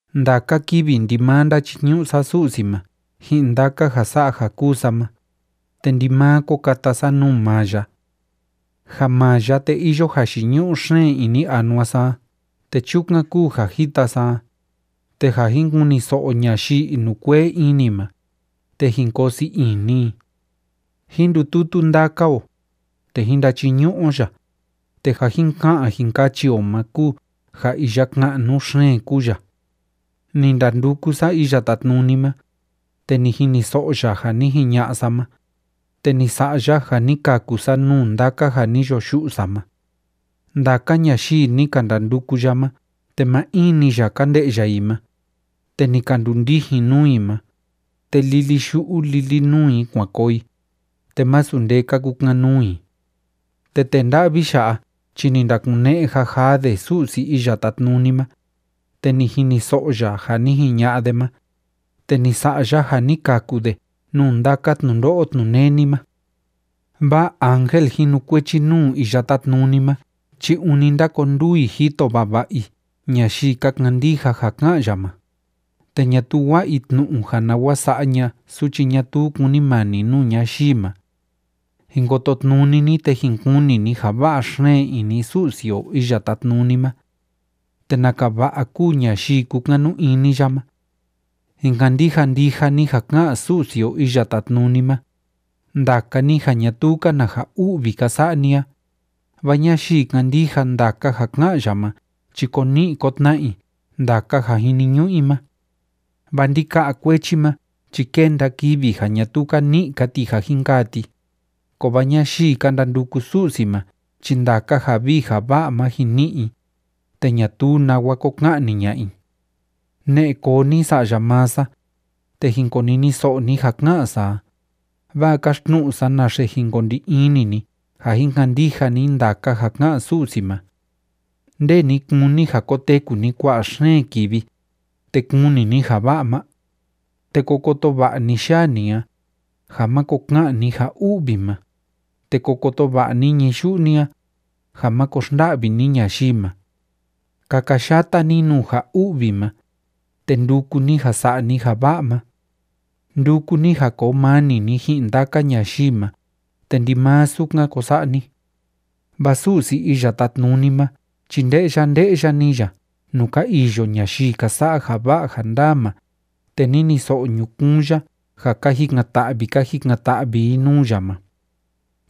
Ndaka kivi ndimaa ndachiñu'u sa Su'si ma ji'in ndaka ja sa'a ja kúu sa ma, te ndimaa ko kata sa nuu maa ya. Ja maa ya, te iyo jayiñu'u xeen ini anua sa a te chukan kúu ja jita sa a, te ja jin kuniso'o ñayii inukuee ini ma, te jin koo sii ini i. Jín ndututu ndaka o, te jín ndachiñu'u o ya, te ja jin ka'an jin kachi o ma kúu ja iya ka'nu xeen kúu ya. Ni ndanduku sa Iya Tátnuni ma, te ni jiniso'o ya ja ni jiña'a sa ma, te ni sa'a ya ja ni kaku sa nuu ndaka ja ni yo yu'u sa ma. Ndaka ñayii ni ka ndanduku ya ma te maa in‑ni ya ka nde'ya i ma, te ni ka ndundijin nuu i ma, te lili yu'u lili nuu i kuan koo i, te masu nde ka kukan‑nuu i. Te tee nda'vi ya'a chi ni ndakune'e jajaa de Su'si Iya Tátnuni ma, te ni jiniso'o ya ja ni jiña'a de ma, te ni sa'a ya ja ni kaku de nuu ndaka tnundo'o tnuneni ma. Vaa ángel jinukuechi nuu Iya Tátnuni ma chi ûni ndákonduu i jito vava'a i ñayii ka kandija ja ká'an ya ma, te ñatuu wa'a i tnu'u ja nawa sa'a ña'a suchi ñatuu kúnimani nuu ñayii ma. Jin kototnuni ni, te jin kuni ni ja va'a xeen ini Su'si o Iya Tátnuni ma. ¡Te naka va'a kúu ñayii kúkanu ini ya ma! Jin kandija ndija ni ja ká'an Su'si o Iya Tátnuni ma, ndaka ni ja ñatuu‑ka na ja u'vi ka sa'a ni a, vaa ñayii kándija ndaka ja ká'an ya ma chi ko ni'i ko tna'a i ndaka ja jiniñu'u i ma. Vaa ndika'a kuechi ma chi kénda kivi ja ñatuu ka ni'i‑ka ti ja jin kaa ti, kovaa ñayii ka ndanduku Su'si ma chi ndaka ja vii ja va'a ma jin ni'i i, te ñatuu nawa ko ka'ni ña'a i. Ne'e koo ni, sa'ya maa sa, te jin koniniso'o ni ja ká'an sa a, vaa káxtnu'u sa naxe jin ko ndi ini ni ja jin kandija ni ndaka ja ká'an Su'si ma. ¿Nde ni kúni ja koteku ni kua'a xeen kivi, te kuni ni ja va'a ma? Te ko koto va'a ni yaa ni a, ja máko ka'an ni ja u'vi ma, te ko koto va'a ni ñií yu'u ni a, ja máko xnda'vi ni ñayii ma. Kakayata ni nuu ja u'vi ma, te nduku ni ja sa'a ni ja va'a ma. Nduku ni ja koo mani ni ji'in ndaka ñayii ma, te ndimaa sukan ko sa'a ni. Vaa Su'si Iya Tátnuni ma chi nde'ya nde'ya‑ni ya nuu ka iyo ñayii ka sa'a ja va'a ja ndaa ma, te niniso'o ñukuun ya ja ka jikan‑ta'vi ka jikan‑ta'vi i nuu ya ma.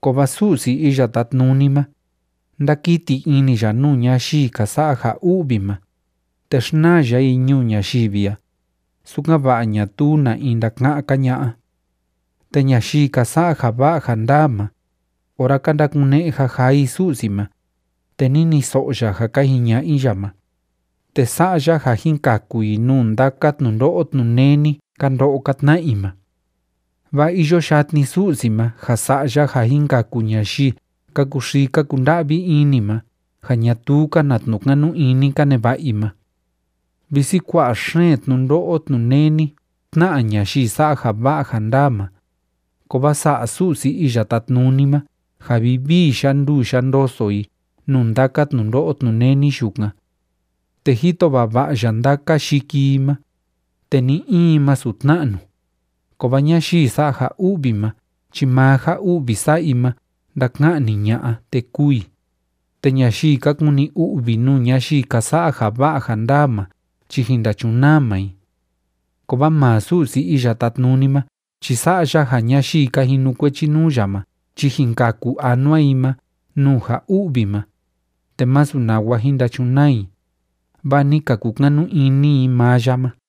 Kovaa Su'si Iya Tátnuni ma, ndákiti ini ya nuu ñayii ka sa'a ja u'vi ma, te xnaa ya i ñuu ñayivi a, sukan‑va'a ñatuu na in ndaka'án‑ka ña'a. Te ñayii ka sa'a ja va'a ja ndaa ma, ora ka ndakune'e jajaa i Su'si ma, te niniso'o ya ja ka jiña'a i ya ma, te sa'a ya ja jin kaku i nuu ndaka tnundo'o tnuneni ka ndo'o ka tna'a i ma. Vaa iyo yatni Su'si ma ja sa'a ya ja jin kaku ñayii ka kuxii ka kunda'vi ini ma ja ñatuu‑ka na tnu'u kanu ini ka neva'a i ma. Visi kua'a xeen tnundo'o tnuneni tná'a ñayii sa'a ja va'a ja ndaa ma, kovaa sa'a Su'si Iya Tátnuni ma ja vivii yanduu yandoso i nuu ndaka tnundo'o tnuneni yukan. Te jito vava'a ya ndaka yiki i ma, te ni‑in masu tna'nu. Kovaa ñayii sa'a ja u'vi ma chi maa ja u'vi sa'a i ma ndaka'ni ña'a, te kûu i, te ñayii ka kuni u'vi nuu ñayii ka sa'a ja va'a ja ndaa ma chi jin ndachunaa maa i. Kovaa maa Su'si Iya Tátnuni ma chi sa'a ya ja ñayii ka jinukuechi nuu ya ma chi jin kaku anua i ma nuu ja u'vi ma, te masu nawa jin ndachunaa i, vaa ni ka kukanu ini i maa ya ma.